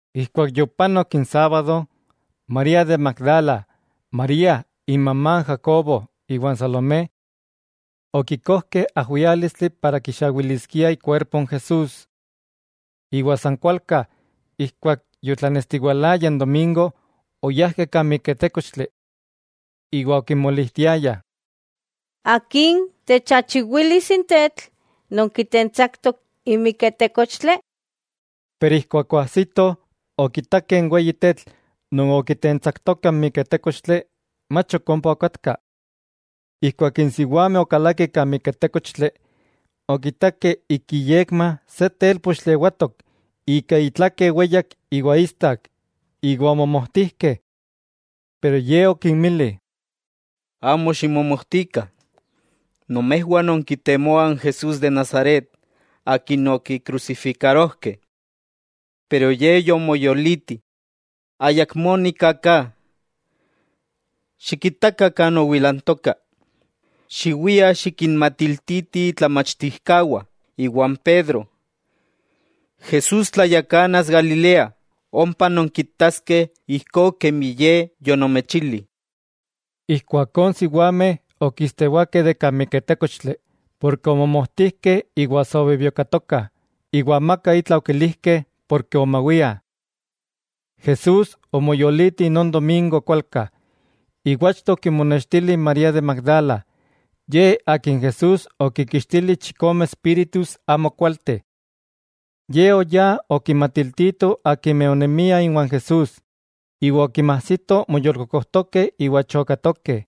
Ijkuak yopanok n sábado, María de Magdala, María imamá n Jacobo, iwa n Salomé. Okikojkeh ajwiálistli para kixawiliskiah ikuerpo n Jesús. Iwa san kualka, ijkuak yotlatlanestiwalaya n domingo, oyajkeh kan miketékochtli. Iwa okimolijtiayah: —¿Akin techachiwilis n tetl non kitentsaktok n miketékochtli? Pero ijkuak oajsitoh, okitakeh n weyi tetl non okitentsaktoka n miketékochtli, mach ok ompa okatka. Ijkuak n siwameh okalakeh kan miketékochtli, okitakeh ik inyekma se télpochtli ewatok ika itlake weyak iwa istak, iwa omomojtijkeh. Pero ye okinmili: —Amo ximomojtikah, nomejwah nonkitemoah n Jesús de Nazaret akin okikrusifikarojkeh. Pero Ye yomoyoliti. Ayakmó nika ka. Xikitakah kan owilantoka. Xiwiah xikinmatiltitih itlamachtijkawah iwa n Pedro: “Jesús tlayakanas Galilea, ompa nonkitaskeh ijkó kemi Ye yonomechili.” Ijkuakó n siwameh okistewakeh de kan miketékochtli, porke omomojtijkeh iwa sa obibiokatokah, iwa amaka itla okilijkeh porke omawiah. Jesús omoyoliti non domingo kualka, iwa achto okimonextili n María de Magdala, ye akin Jesús okinkixtili chikome espíritus amokualteh. Ye oyá okinmatiltito akimeh onemiah iwan Jesús, iwa okimajsito moyolkokojtokeh iwa chokatokeh.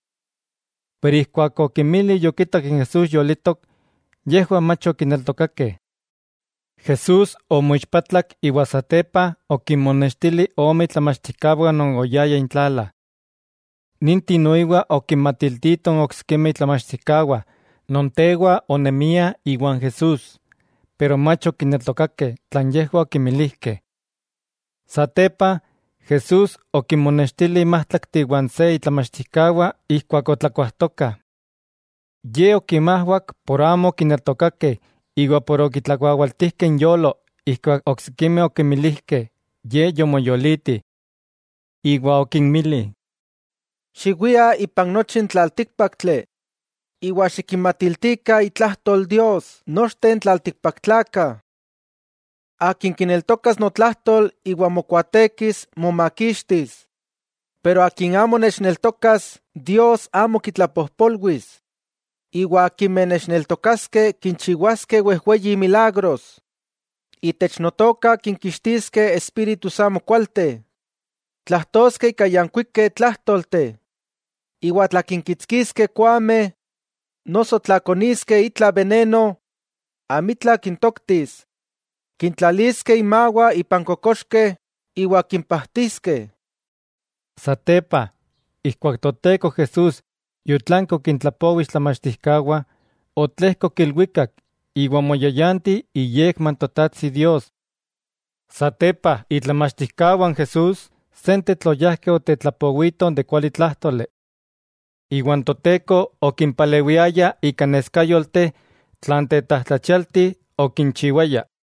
Pero ijkuak okinmili yokitak n Jesús yolitok, yejwah mach okineltokakeh. Jesús omoixpatlak iwa satepa okinmonextili ome itlamachtijkawah non oyayah intlala. Ninteh noiwa okinmatiltitoh n oksikimeh itlamachtijkawah non tewa onemiah iwan Jesús, pero mach okineltokakeh tlan yejwah okimilijkeh. Satepa Jesús okinmonextili n májtlakteh iwa n se itlamachtijkawah ijkuak otlakuajtokah. Ye okinmajwak por amo okineltokakeh iwa por okitlakuawaltijkeh inyolo ijkuak oksikimeh okimilijkeh Ye yomoyoliti. Iwa okinmili: —Xiwiah ipan nochi n tlaltíkpaktli iwa xikinmatiltikah itlajtol Dios nochteh n tlaltikpaktlakah. Akin kineltokas notlajtol iwa mokuaatekis momakixtis, pero akin amo nechneltokas Dios amo kitlapojpolwis. Iwa akimeh nechneltokaskeh kinchiwaskeh wejweyi milagros: Itech Notoka kinkixtiskeh espíritus amokualteh, tlajtoskeh ika yankuikeh tlájtolteh, iwa tla kinkitskiskeh koameh noso tla koniskeh itla beneno, amitla kintoktis. Kintlaliskeh inmawah ipan kokoxkeh iwa kimpajtiskeh. Satepa, ijkuak Toteko Jesús yotlanki okintlapowi itlamachtijkawah, otlejkok ilwikak iwa omoyayanti iyekma n Totajtsi Dios. Satepa, itlamachtijkawah n Jesús sentetl oyajkeh otetlapowitoh de n kualitlájtoli. Iwa n Toteko okimpalewiaya ika neskayolteh tlan tetlajtlachialti okinchiwayah.